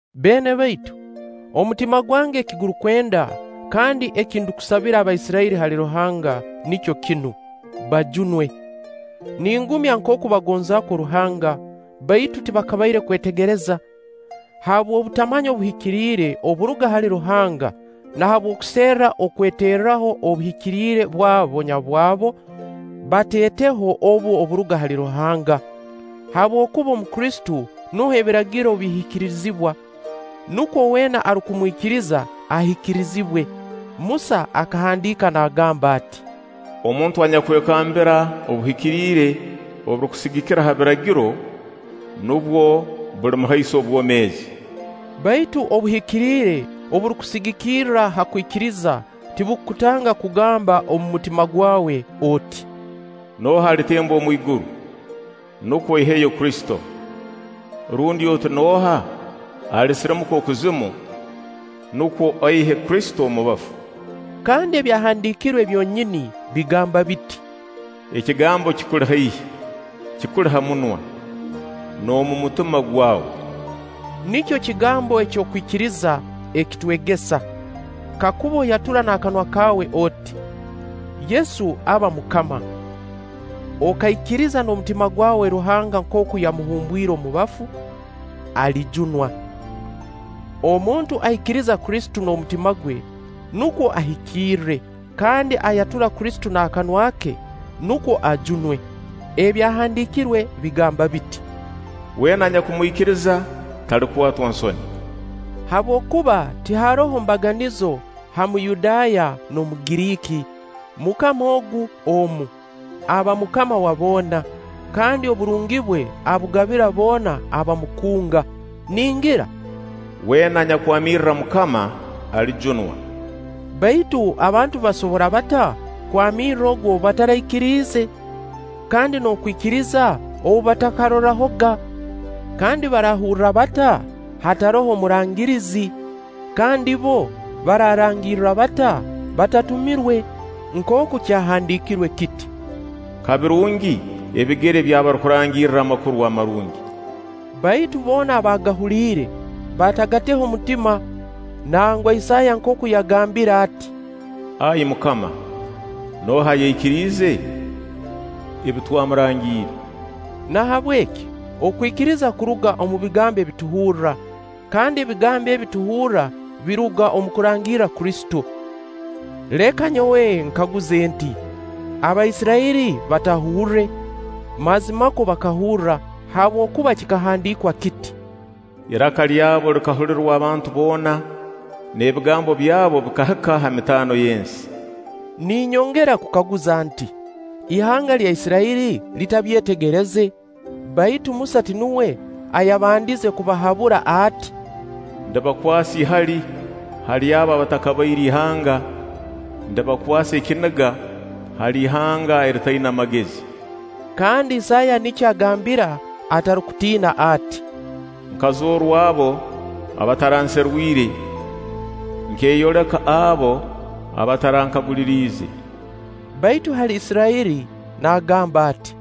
Beene baitu, omutima gwange eki gurukwenda, kandi eki ndukusabira Abaisirairi hali Ruhanga, nikyo kinu: bajunwe. Ningumya nkooku bagonza kwo Ruhanga, baitu tibakabaire kwetegereza. Habw'okutamanya obuhikiriire oburuga hali Ruhanga na habw'okuserra okweteeraho obuhikiriire bwabo nyabwabo, bateeteho obu oburuga hali Ruhanga. Habwokuba omu Kristo nuho Ebiragiro bihikirizibwa, nukwo weena arukumwikiriza ahikirizibwe. Musa akahandiika naagamba ati: Omuntu anyakwekambira obuhikiriire oburukusigikira ha Biragiro, nubwo bulimuhaisa obwomeezi. Baitu obuhikiriire oburukusigikira ha kwikiriza tibukutanga kugamba omu mutima gwawe oti: “Nooha alitemba omu iguru?” [Nukwo aiheyo Kristo]. Rundi oti: “Nooha alisirimuka okuzimu?” [Nukwo aihe Kristo omu bafu]. Kandi Ebyahandiikirwe byonyini bigamba biti: Ekigambo kikuli haihi, kikuli ha munwa, n'omu mutima gwawe. [Nikyo kigambo eky'okwikiriza ekitwegesa]. Kakuba oyatura n'akanwa kaawe oti: Yesu aba MUKAMA, okaikiriza n'omutima gwawe Ruhanga nkooku yamuhumbwire omu bafu, alijunwa. Omuntu aikiriza Kristo n'omutima gwe, nukwo ahikirre; kandi ayatura Kristo n'akanwa ke, nukwo ajunwe. Ebyahandiikirwe bigamba biti: “Weena anyakumwikiriza, talikwatwa nsoni.” Habwokuba tiharoho mbaganizo ha Muyudaaya n'Omugiriiki: MUKAMA ogu omu, aba MUKAMA wa boona, kandi oburungi bwe abugabira boona abamukunga. Ningira: “Weena anyakwamirra MUKAMA alijunwa.” Baitu abantu basobora bata kwamirra ogu ou bataraikiriize? Kandi n'okwikiriza ou batakahurrahoga? Kandi barahurra bata, hataroho murangirize? Kandi bbo bararangirra bata, batatumirwe? Nkooku kyahandiikirwe kiti: “Ka birungi ebigere by'abarukurangirra Amakuru Amarungi!” Baitu boona abaagahuliire, batagateho mutima, nangwa. Isaaya nkooku yagambire ati: “Ai MUKAMA, nooha ayaikiriize ebi twamurangiire?” Nahabweki okwikiriza kuruga omu bigambo ebi tuhurra, kandi ebigambo ebi tuhurra biruga omu kurangirra Kristo. Leka nyowe nkaguze nti: Abaisirairi batahurre? Mazimakwo bakahurra, habwokuba kikahandiikwa kiti: “Iraka lyabo likahulirwa abantu boona, n'ebigambo byabu bikahika ha mitaano y'ensi.” Ninyongera kukaguza nti: Ihanga lya Isirairi litabyetegereze? Baitu Musa ti nuwe ayabandize kubahabura ati: “Ndibakwasa ihali hali abo abatakabaire ihanga; ndibakwasa ekiniga hali ihanga eritaina magezi.” Kandi Isaaya nikyo agambira atarukutiina ati: “Nkazoorwa abo abataranserwire; nkeeyoleka abo abatarankaguliriize.” Baitu hali Isirairi naagamba ati: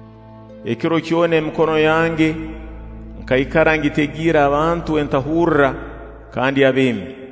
“Ekiro kyona emikono yange nkaikara ngitegiire abantu entahurra kandi abeemi.”